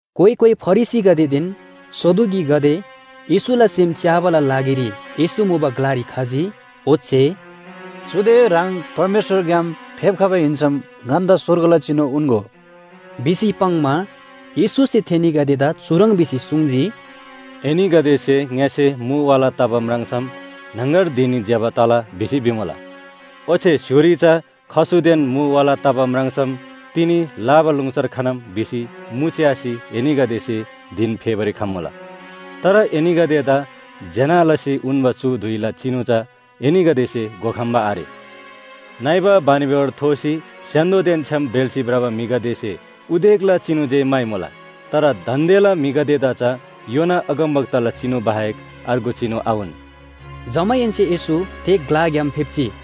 कोइ कोइ फरिसीगदेदेन सदुकीगदे येशूला सेम च्‍याबाला लागिरी येशू मुबा ग्‍लारी खजी। ओच्‍छे “चुदे ह्राङ परमेश्‍वरग्‍याम फेप्‍खबा हिन्‍सम ङन्‍दा स्‍वर्गला चिनु उन्‍गो” भिसी पाङ्‌मा, येशूसे थेनीगदेदा चुह्रङ् भिसी सुङ्जी, “एनीगदेसे ङ्‍यसे मु वाला तबा म्राङ्सम ‘न्‍हङगर धिन ज्‍यबा तला’ भिसी भिमुला। ओच्‍छे स्‍य्‍होरी चा खसुदेन मु वाला तबा म्राङ्सम ‘तिनी लाबालुङसर खनम’ भिसी मु च्‍यासी एनीगदेसे धिन फेबारी खम्मुला। तर एनीगदेदा ज्‍यना लसी उन्‍बा चु धुइला चिनु चा एनीगदेसे घोखम्‍बा आरे। नइबा बानिबेहोर थोसी स्‍य्‍हान्‍दोदेन छ्‌याम ब्रेल्‍सी भ्रबा म्‍हिगदेसे उदेकला चिनु जे म्‍हाइमुला। तर दान्‍देला म्‍हिगदेदा चा योना अगमवक्ताला चिनु बाहेक अर्गु चिनु आउन।” जमाहेन्‍से येशू थे ग्‍लाग्‍याम फेप्‍जी।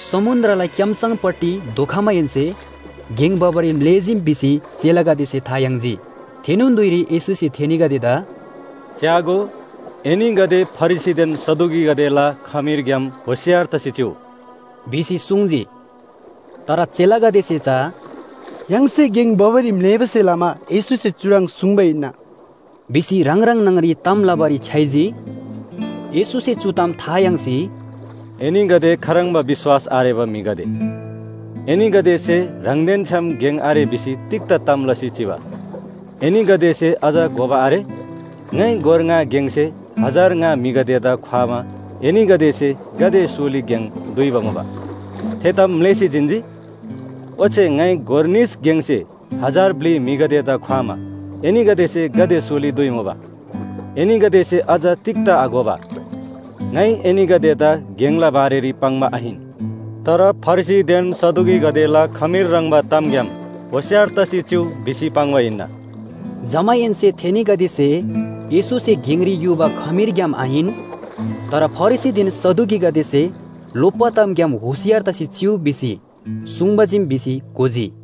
समुन्‍द्रला क्‍यामसङपट्टि धोखमाहेन्‍से गेङ भबारी म्‍लेःजीम भिसी चेलागदेसे था याङ्जी। थेनोन धुइरी येशूसे थेनीगदेदा “च्‍यागो, एनीगदे फरिसीदेन सदुकीगदेला खमीरग्‍याम होशियार तसी चिउ” भिसी सुङ्जी। तर चेलागदेसे चा “य्‍हाङसे गेङ भबारी म्‍लेःबासे लमा येशूसे चुह्रङ् सुङ्बा हिन्‍ना” भिसी ह्राङ ह्राङ न्‍हङ‍री ताम लबारी छ्‌याइजी। येशूसे चु ताम था याङ्सी, “एनीगदे खाह्रङ्बा विश्‍वास आरेबा म्‍हिगदे! एनीगदेसे ह्राङदेन छ्‌याम गेङ आरे भिसी तिग्‍दा ताम लसी चिबा? एनीगदेसे अझ घोबा आरे? ङाइ गोर ङा गेङसे हजार ङा म्‍हिगदेदा ख्‍वामा एनीगदेसे गाते सोली गेङ दुइबा मुबा? थे ताम म्‍लेःसी जिन्‍जी? ओच्‍छे ङाइ गोर निस गेङसे हजार ब्‍लि म्‍हिगदेदा ख्‍वामा एनीगदेसे गाते सोली दुइमुबा? एनीगदेसे अझ तिग्‍दा आघोबा? ङाइ एनीगदेदा गेङला बारेरी पाङ्बा आहिन। तर फरिसीदेन सदुकीगदेला खमीर ह्रङ्‌बान तामग्‍याम होशियार तसी चिउ” भिसी पाङ्बा हिन्‍ना। जमाहेन्‍से थेनीगदेसे येशूसे गेङरी युबा खमीरग्‍याम आहिन, तर फरिसीदेन सदुकीगदेसे लोप्‍बा तामग्‍याम होशियार तसी चिउ भिसी सुङ्बा चीम भिसी घोजी।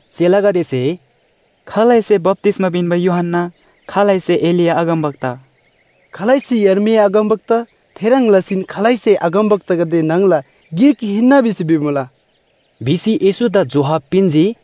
चेलागदेसे “खालैसे बप्‍तिस्‍मा पिन्‍बा यूहन्‍ना, खालैसे एलिया अगमवक्ता, खालैसे यर्मिया अगमवक्ता थेह्रङ् लसीन खालैसे अगमवक्तागदे न्‍हङला गिक हिन्‍ना भिसी भिमुला” भिसी येशूदा जोहाब पिन्‍जी।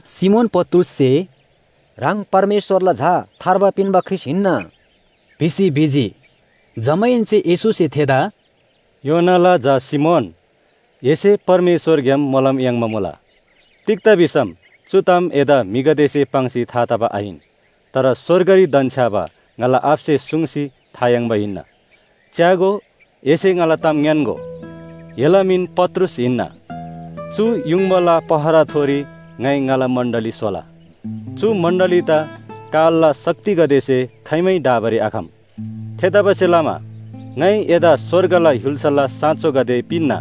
सिमोन पत्रुससे “ह्राङ परमेश्‍वरला झा थार्बा पिन्‍बा ख्रीष्‍ट हिन्‍ना” भिसी भिजी। जमाहेन्‍से येशूसे थेदा “योनाला झा सिमोन, एसे परमेश्‍वरग्‍याम मोलम याङ्बा मुला। तिग्‍दा भिसम चु ताम एदा म्‍हिगदेसे पाङ्सी था तबा आहिन। तर स्‍वर्गरी धन्‍छ्‌याबा ङाला आबासे सुङ्सी था याङ्बा हिन्‍ना। च्‍यागो, एसे ङाला ताम ङ्‌यान्‍गो, एला मिन पत्रुस हिन्‍ना। चु युङबाला पहराथोरी ङाइ ङाला मण्‍डली स्‍होला। चु मण्‍डलीदा कालला शक्तिगदेसे खाइमै ढाबारी आखम। थेतबासेलमा ङाइ एदा स्‍वर्गला य्‍हुल्‍साला साँचोगदे पिन्‍ना।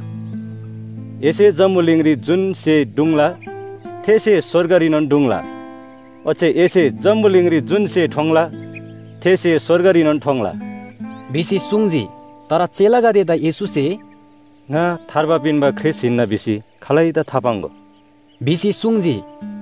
एसे जम्‍बुलिङरी जुन स्‍हे ढुङ्ला, थे स्‍हे स्‍वर्गरीनोन ढुङ्ला। ओच्‍छे एसे जम्‍बुलिङरी जुन स्‍हे ठोङ्ला, थे स्‍हे स्‍वर्गरीनोन ठोङ्ला” भिसी सुङ्जी। तर चेलागदेदा येशूसे “ङा थार्बा पिन्‍बा ख्रीष्‍ट हिन्‍ना भिसी खालैदा थापाङ्‍गो” भिसी सुङ्जी।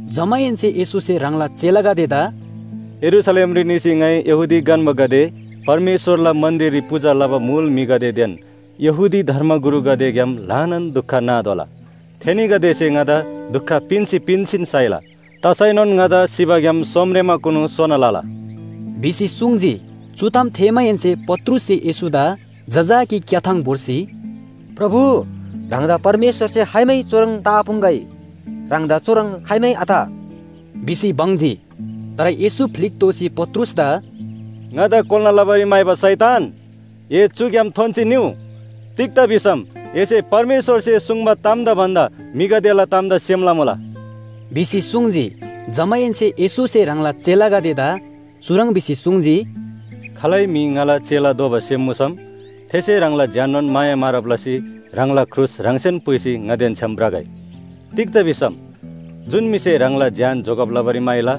जमाहेन्‍से येशूसे ह्राङला चेलागदेदा “यरूशलेमरी निसी ङाइ यहूदी गन्‍बागदे, परमेश्‍वरला मन्‍दिररी पूजा लबा मुल म्‍हिगदेदेन यहूदी धर्मगुरुगदेग्‍याम ल्‍हानान दुख नातोःला। थेनीगदेसे ङादा दुख पिन्‍सी पिन्‍सीन साइला। तसैनोन ङादा सिबाग्‍याम सोमरेमाकुनु सोना लला” भिसी सुङ्जी। चु ताम थेःमाहेन्‍से पत्रुससे येशूदा जजाकी क्‍याथाङ भोर्सी “प्रभु, ह्राङदा परमेश्‍वरसे खाइमै चुह्रङ् तआपुङ्‍गै, ह्राङदा चुह्रङ् खाइमै आत!” भिसी बङ्जी। तर येशू फ्‍लिक दोःसी पत्रुसदा “ङादा कोल्‍ना लबारी म्‍हाइबा शैतान, ए चुग्‍याम थोन्‍सी निउ! तिग्‍दा भिसम एसे परमेश्‍वरसे सुङ्बा तामदा भन्‍दा म्‍हिगदेला तामदा सेम लमुला” भिसी सुङ्जी। जमाहेन्‍से येशूसे ह्राङला चेलागदेदा चुह्रङ् भिसी सुङ्जी, “खालै म्‍हि ङाला चेला दोबा सेम मुसम थेसे ह्राङला ज्‍याननोन माया मारब लसी ह्राङला क्रुस ह्राङसेन पुइसी ङादेन छ्‌याम भ्रगै। तिग्‍दा भिसम जुन म्‍हिसे ह्राङला ज्‍यान जोगब लबारी म्‍हाइला,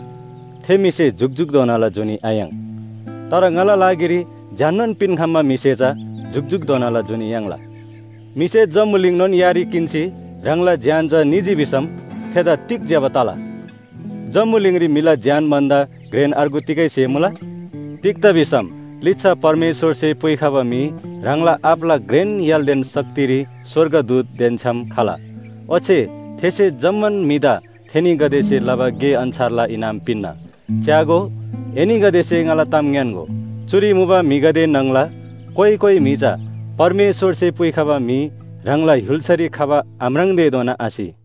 थे म्‍हिसे जुकजुकधोनाला जुनी आयाङ्। तर ङाला लागिरी ज्‍याननोन पिन्‍खम्‍बा म्‍हिसे चा जुकजुकधोनाला जुनी याङ्ला। म्‍हिसे जम्‍बुलिङनोन यारी किन्‍सी ह्राङला ज्‍यान चा निजी भिसम थेदा तिग ज्‍यबा तला? जम्‍बुलिङरी म्‍हिला ज्‍यान भन्‍दा घ्रेन अर्गु तिगै स्‍हे मुला? तिग्‍दा भिसम लिच्‍छा परमेश्‍वरसे पुइखबा म्‍हि ह्राङला आबाला घ्रेन य्‍हालदेन शक्तिरी स्‍वर्गदूतदेन छ्‌याम खला। ओच्‍छे थेसे जम्‍मान म्‍हिदा थेनीगदेसे लबा गे अन्‍छारला इनाम पिन्‍ना। च्‍यागो, एनीगदेसे ङाला ताम ङ्‌यान्‍गो, चुरी मुबा म्‍हिगदे न्‍हङला कोइ कोइ म्‍हि चा परमेश्‍वरसे पुइखबा म्‍हि ह्राङला य्‍हुल्‍सारी खबा आम्राङ्तेधोना आसि।”